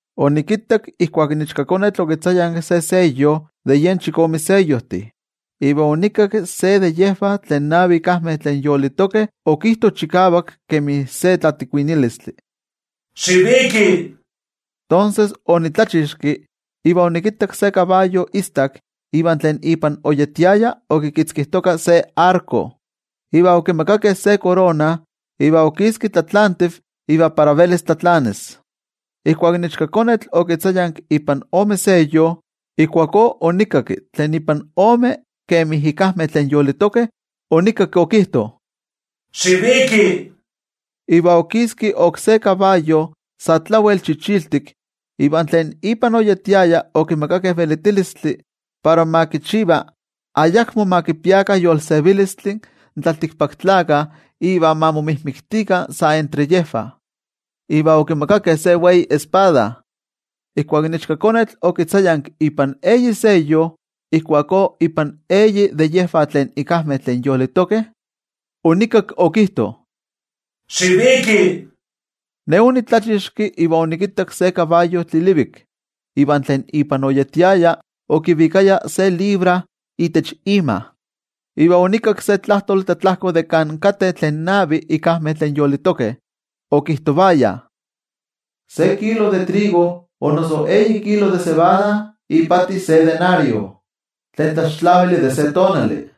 Onikittak ijkuak in Ichkakonetl okitzayanki se seyo de yen chikome seyojtih, iva onikakki se de yejvah tlen navi ikajmeh tlen yolitokeh okijto chikavak kemi se tlatikuinilistli: —¡Xiviki! Tonses ne onitlachixki, iva onikittak se kabayo istak, iva tlen ipan oyetiaya okitzkijtoka se arko. Iva okimakakeh se korona, iva okiski tlatlantiv iva para velis tlatlanis. Ijkuak in Ichkakonetl okitzayanki ipan ome seyo, ijkuakó onikakki tlen ipan ome kemi ikajmeh tlen yolitokeh, onikakki okijto: —¡Xiviki! Iva okiski oksé kabayo sa tlawel chichiltik. Iva tlen ipan oyetiaya okimakakeh velitilistli para ma kichiva ayakmo ma kipiakah yolsevilistli in tlaltikpaktlakah iva ma momijmiktikah sa entre yejvah. Iva okimakakeh se wei espada. Ijkuak in Ichkakonetl okitzayanki ipan eyi seyo, ijkuakó ipan eyi de yejvah tlen ikajmeh tlen yolitokeh, onikakki okijto: —¡Xiviki! Ne onitlachixki, iva onikittak se kabayo tlilivik. Iva tlen ipan oyetiaya okivikaya se libra itech ima. Iva onikakki se tlajtoli tlatlajko de kan kateh tlen navi ikajmeh tlen yolitokeh, okijtovaya: —Se kilo de trigo o noso eyi kilo de cebada ipati se denario, tlen tlaxtlavili de se tonali.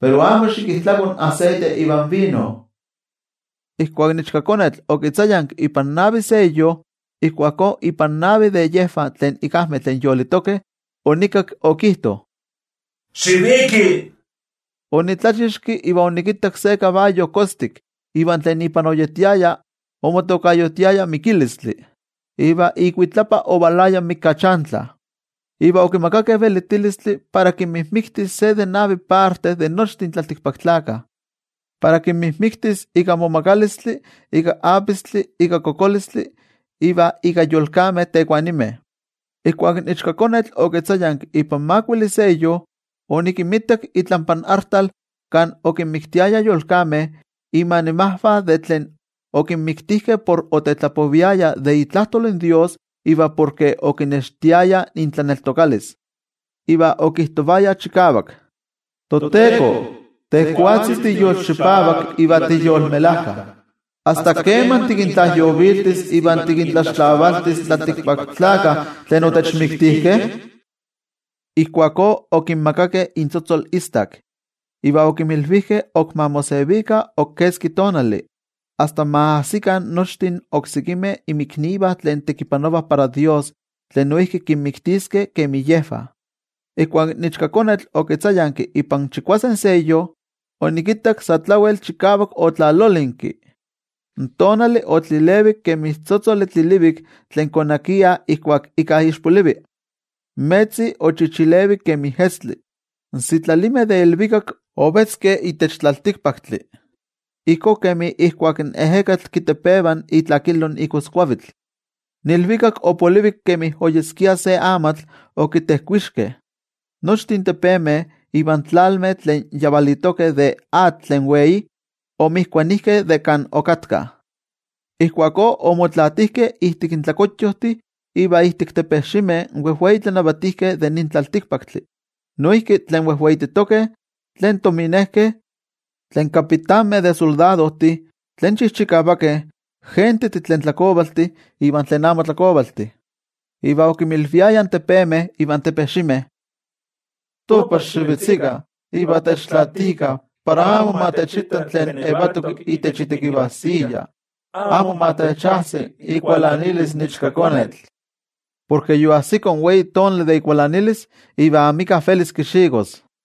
Pero amo xikijtlako in aseite ivan vino. Ijkuak in Ichkakonetl okitzayanki ipan navi seyo, ijkuakó ipan navi de yejvah tlen ikajmeh tlen yolitokeh, onikakki okijto: —¡Xiviki! Onitlachixki, iva onikittak se kabayo kostik. Iva tlen ipan oyetiaya omotokayotiaya Mikilistli, iva ikuitlapa ovalaya in Mikachantli. Iva okimakakeh velitilistli para kinmijmiktis se de navi parte de nochtin tlaltikpaktlakah, para kinmijmiktis ika momagalistli, ika apistli, ika kokolistli iva ika yolkameh tekuanimeh. Ijkuak in Ichkakonetl okitzayanki ipan makuili seyo, onikittak itlampa artal kan okinmiktiayah yolkameh inmanimajvah de tlen okinmiktijkeh porke otetlapoviayah de itlajtol in toYejwatzi iva porke okinextiayah intlaneltokalis. Iva okijtovayah chikavak: —ToTeko, tejwatzi tiyolchipavak iva tiyolmelajka, ¿asta keman tikintlajyoviltis iva tikintlaxtlavaltis in tlaltikpaktlakah tlen otechmiktijkeh? Ijkuakó okinmakakeh intzotzol istak, iva okinmilvijkeh ok ma mosevikah ok keski tonali, asta ma ajsikah nochtin oksekimeh inmiknivah tlen tekipanovah para toYejwatzi tlen noijki kinmiktiskeh kemi yejvah. Ijkuak in Ichkakonetl okitzayanki ipan chikuase seyo, onikittak sa tlawel chikavak otlalolinki. In tonali otlilevik kemi tzotzoli tlilivik tlen konakiah ijkuak íkka ixpolivi. In metzi ochichilevik kemi estli. In sitlalimeh de ilvikak ovetzkeh itech tlaltikpaktli, ijkó kemi ijkuak in ejekatl kitepeva itlakilo in igoskuavitl. In ilvikak opolivik kemi oyeskia se amatl okimilojkeh. Nochtin tepemeh ivan tlalmeh tlen yavalitokeh de atl tlen wei omijkuanijkeh de kan okatkah. Ijkuakó omotlaatijkeh ijtik tlakuyojtih iva ijtik tepejximeh in wejwei tlanavatijkeh de nin tlaltikpaktli, noijki tlen wejweititokeh, tlen tominejkeh, tlen kapitanmeh de soldadojtih, tlen chijchikavakeh, gentejtih tlen tlakovaltih iva tlen amo tlakovaltih. Iva okinmilviayah in tepemeh ivan tepejximeh: —Topah xivetzikah, iva techtlaatikah para amo ma techitta tlen yetok itech itekivajsiya. Amo ma techajsi ikualanilis in Ichkakonetl. Porke yoajsiko in wei tonali de ikualanilis, iva amika velis kixikos.